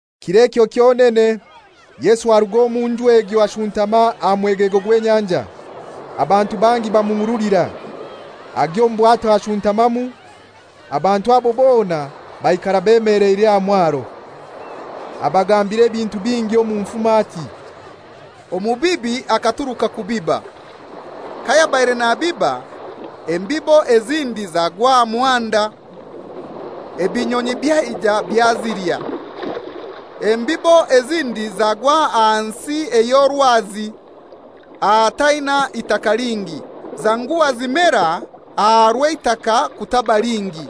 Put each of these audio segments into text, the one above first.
Kir'ekyo kyonene Yesu aruga omu nju egyo ashuntama aha mwegego gw'enyanja. Abantu bangi bamuhurulira, agya omu bwato ashuntamamu. Abantu abo bona baikara bemeleire aha mwaro. Abagambira ebintu bingi omu nfumo ati, «Omubibi akaturuka kubiba. Kayabaire nabiba, embibo ezindi zagwa aha muhanda, ebinyonyi byaija byazilya. Embibo ezindi zagwa aha nsi ey'orwazi ahataina itaka lingi, zanguha zimera aha rw'eitaka kutaba lingi.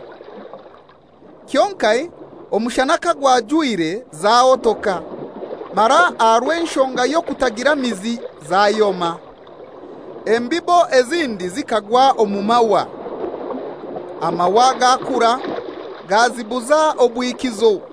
Kyonkai omushana kagwajwire zahotoka, mara aha rw'enshonga y'okutagira mizi zayoma. Embibo ezindi zikagwa omu mahwa, amahwa gakura gazibuza obwikizo.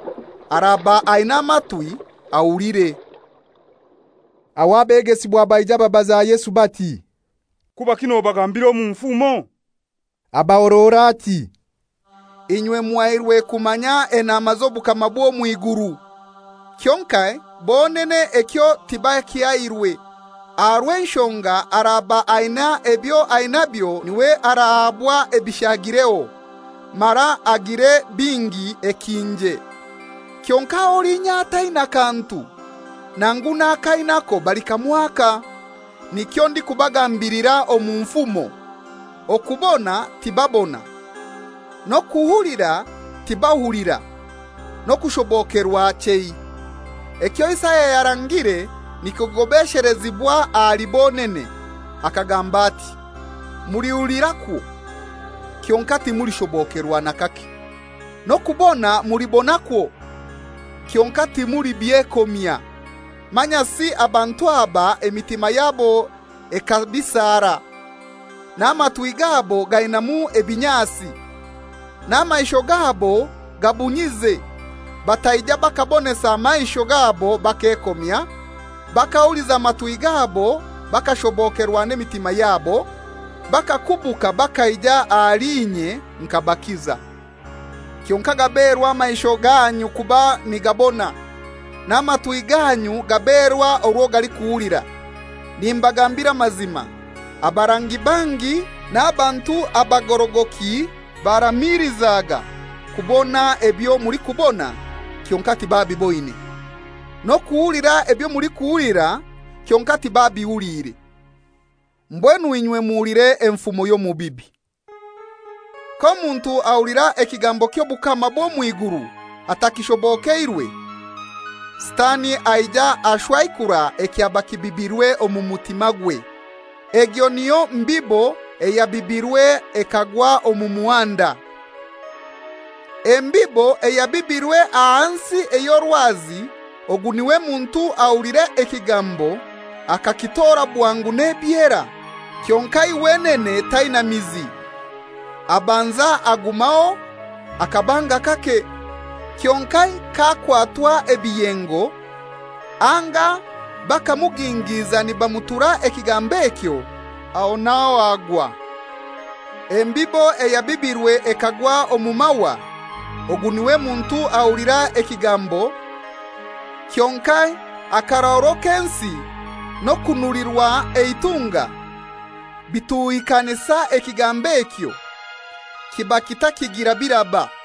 Araba aina amatwi ahulire.» Aho abegesibwa baija babaza Yesu bati, «Kubaki nobagambira omu nfumo?» Abahorora ati, «Inywe muhairwe kumanya enama z'obukama bw'omw'iguru, kyonkai bonene ekyo tibakihairwe. Aha rw'enshonga araba aina ebyo ainabyo niwe arahabwa ebishagireho, mara agire bingi ekinje. Kyonkai olinya ataina kantu, nangu n'ako ainako balikamwaka. Nikyo ndikubagambilira omu nfumo, okubona tibabona, n'okuhulira tibahulira, n'okushobokerwa chei. Ekyo Isaya yarangire nikigobeshelezibwa ahali bonene, akagamba ati, ‹Mulihulirakwo, kyonkai timulishobokerwa n'akake, N'okubona mulibonakwo, kyonkai timulibyekomya. Manyasi abantu aba emitima yabo ekabisara, n'amatwi gabo gainamu ebinyasi, n'amaisho gabo gabunyize, bataija bakabonesa maisho gabo bakekomya, bakahuliza matwi gabo, bakashobokerwa n'emitima yabo, bakakubuka bakaija ahali inye nkabakiza.›» «Kyonkai gaberwa amaisho ganyu kuba nigabona, n'amatwi ganyu gaberwa orwo galikuhulira. Nimbagambira amazima, abarangi bangi n'abantu abagorogoki baramiilizaga kubona ebyo mulikubona, kyonkai tibabiboine; n'okuhulira ebyo mulikuhulira, kyonkai tibabihuliire.» «Mbwenu inywe muhulire enfumo y'omubibi. K'omuntu ahulira ekigambo ky'obukama bw'omw'iguru atakishobokeirwe, sitani aija ashwaikura ekyaba kibibirwe omu mutimagwe; egyo niyo mbibo eyabibirwe ekagwa omu muhanda. Embibo eyabibirwe aha nsi ey'orwazi, ogu niwe muntu ahulira ekigambo akakitora bwangu n'ebyera, kyonkai wenene taina mizi, abanza agumaho akabanga kake, kyonkai k'akwatwa ebiyengo anga bakamugingiiza nibamutura ekigambo ekyo, aho n'aho agwa. Embibo eyabibirwe ekagwa omu mahwa, ogu niwe muntu ahulira ekigambo, kyonkai akarahuro k'ensi n'okunulirwa eitunga bituhikanisa ekigambo ekyo, kiba kitakigira biraba.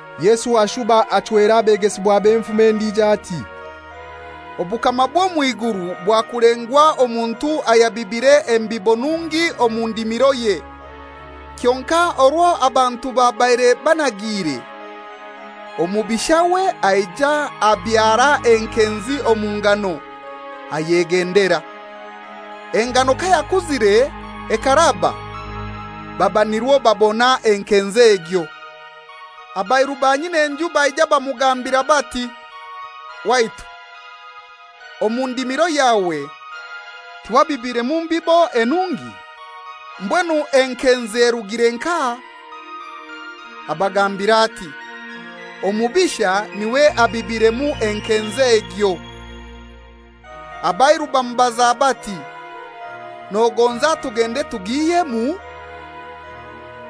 Yesu ashuba bachwera abegesibwabe enfumo endijo ati, «Obukama bw'omw'iguru bwakulengwa omuntu ayabibire embibo nungi omu ndimiroye. Kyonkai orwo abantu babaire banagiire, omubishawe aija abyara enkenzi omu ngano, ayegendera. Engano kayakuzire ekaraba, baba nirwo babona enkenzi egyo. Abairu ba nyin'enju baija bamugambira bati, ‹Waitu, omu ndimiro yawe tiwabibiremu mbibo enungi? Mbwenu enkenzi erugire nkahai?› Abagambira ati, ‹Omubisha niwe abibiremu enkenzi egyo.› Abairu bamubaza bati, ‹Nogonza tugende tugihyemu?›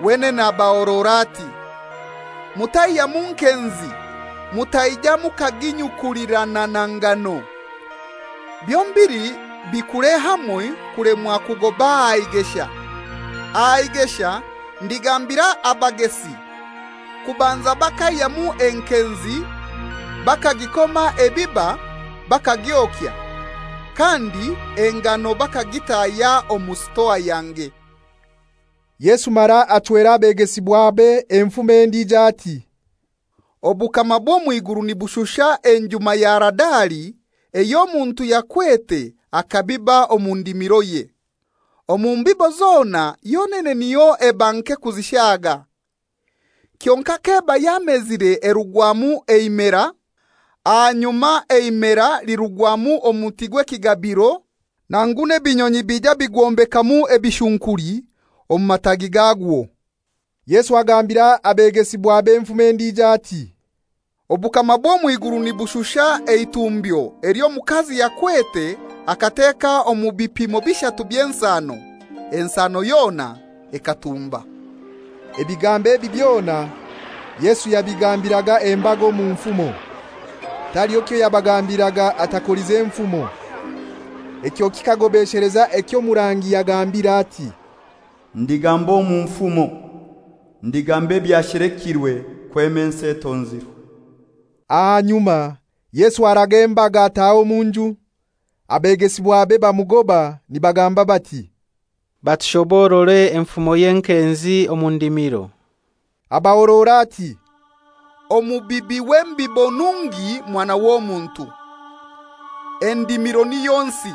Wenene abahorora ati, ‹Mutaihyamu nkenzi mutaija mukaginyukulirana na ngano. Byombili bikure hamoi kulemwa kugoba aha igesha. Aha igesha ndigambira abagesi kubanza bakaihyamu enkenzi bakagikoma ebiba bakagyokya, kandi engano bakagitahya omu sitoa yange.›» Yesu mara bachwera abegesibwabe enfumo endijo ati, «Obukama bw'omw'iguru nibushusha enjuma ya Haradali ey'omuntu yakwete akabiba omu ndimiroye. Omu mbibo zona yonene niyo eba nke kuzishaga. Kyonkai k'eba yamezire erugwamu eimera, ahanyuma eimera lirugwamu omuti gw'ekigabiro, nangu n'ebinyonyi bija bigwombekamu ebishunkuli omu matagi gagwo.» Yesu bagambira abegesibwabe enfumo endijo, ati, «Obukama bw'omw'iguru nibushusha eitumbyo ely'omukazi yakwete akateka omu bipimo bishatu by'ensano, ensano yona ekatumba.» Ebigambo ebi byona Yesu yabigambiraga embaga omu nfumo. Taliho kyoyabagambiraga atakolize nfumo. Ekyo kikagobesheleza eky'omurangi yagambire ati, «Ndigamba omu nfumo, ndigamba ebyashelekirwe kwema ensi etonzirwe.» Ahanyuma Yesu araga embaga ataha omu nju. Abegesibwabe bamugoba nibagamba bati, «Batushoborore enfumo y'enkenzi omu ndimiro.» Abahorora ati, «Omubibi w'embibo nungi Mwana w'Omuntu. Endimiro niyo nsi,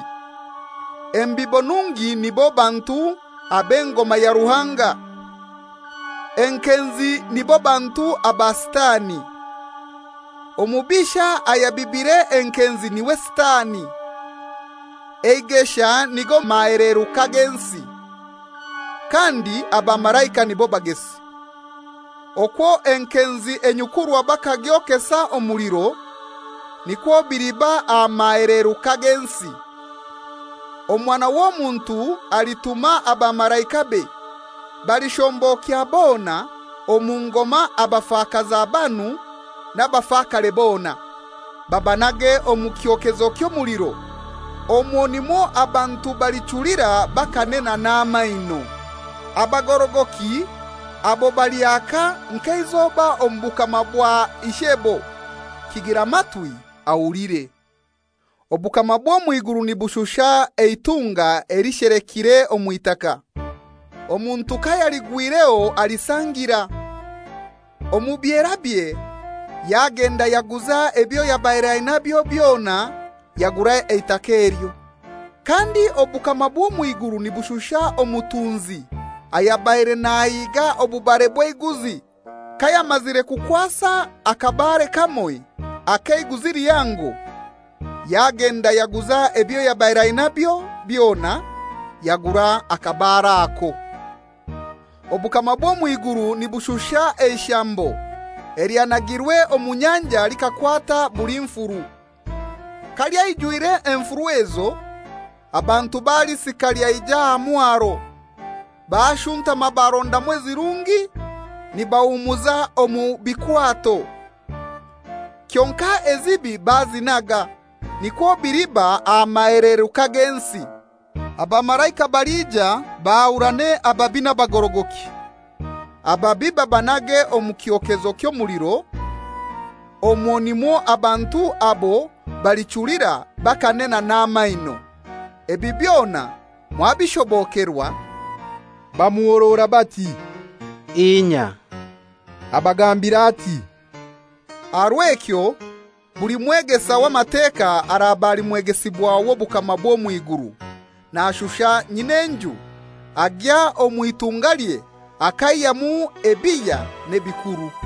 embibo nungi nibo bantu ab'engoma ya Ruhanga. Enkenzi nibo bantu aba Sitani. Omubisha ayabibire enkenzi niwe Sitani. Eigesha nigo maheleruka g'ensi, kandi abamalaika nibo bagesi. Okwo enkenzi enyukurwa bakagyokesa omuliro, nikwo biliba aha maheleruka g'ensi. Omwana w'Omuntu alituma abamalaikabe, balishombokya bona omu ngoma abafakaza banu n'abafakare bona, babanage omu kyokezo ky'omuliro; omwo nimwo abantu balichulira bakanena n'amaino. Abagorogoki abo balyaka nk'eizoba omu bukama bwa Ishebo. Kigira matwi ahulire.» «Obukama bw'omw'iguru nibushusha eitunga elishelekiire omw'itaka. Omuntu kayaligwireho alisangira. Omu byerabye yagenda yaguza ebyo yabaire ainabyo byona yagura eitaka elyo.» «Kandi obukama bw'omw'iguru nibushusha omutunzi ayabaire nahiga obubare bw'eiguzi. Kayamazire kukwasa akabare kamoi ak'eiguzi lihango, yagenda yaguza ebyo yabaire ainabyo byona, yagura akabare ako.» «Obukama bw'omw'iguru nibushusha eishambo elyanagirwe omu nyanja likakwata buli nfuru. Kalyaijwire enfuru ezo, abantu balisika lyaija aha mwaro, bashuntama barondamu ezirungi nibahumuza omu bikwato, kyonkai ezibi bazinaga. Nikwo biliba aha maheleruka g'ensi. Abamalaika balija bahurane ababi n'abagorogoki, ababi babanage omu kyokezo ky'omuliro; omwo nimwo abantu abo balichulira bakanena n'amaino.» «Ebi byona mwabishobokerwa?» Bamuhorora bati, «Inya.» Abagambira ati, «Aha rw'ekyo buli mwegesa w'Amateka araba ali mwegesibwa w'obukama bw'omw'iguru nashusha nyin'enju agya omw'itungalye akaihyamu ebihya n'ebikuru.»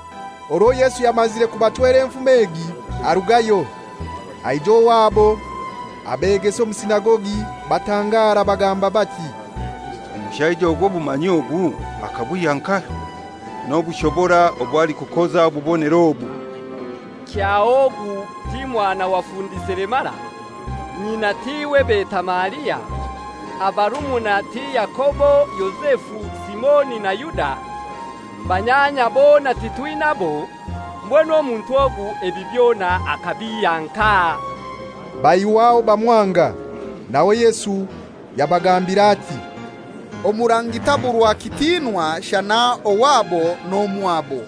Orwo Yesu yamazire kubachwera enfumo egi, arugayo, aija owabo abegesa omu sinagogi, batangara, bagamba bati, «Omushaija ogu obumanyi obu akabwihya nkahai, n'obushobora obw'alikukoza obubonero aga? Kyaho ogu ti mwana wa fundi selemara? Nyina tiwe beta Maria? Abarumuna ti Yakobo, Yozefu, Simoni na Yuda? Banyanya bona titwinabo? Mbwenu omuntu ogu ebi byona akabihya nkahai?» Baihw'aho bamwanga. Nawe Yesu yabagambira ati, «Omurangi taburwa kitinwa shana owabo n'omwabo.»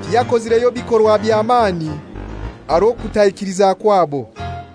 Tiyakozireyo bikorwa bya mani, aha rw'okutaikiliza kwabo.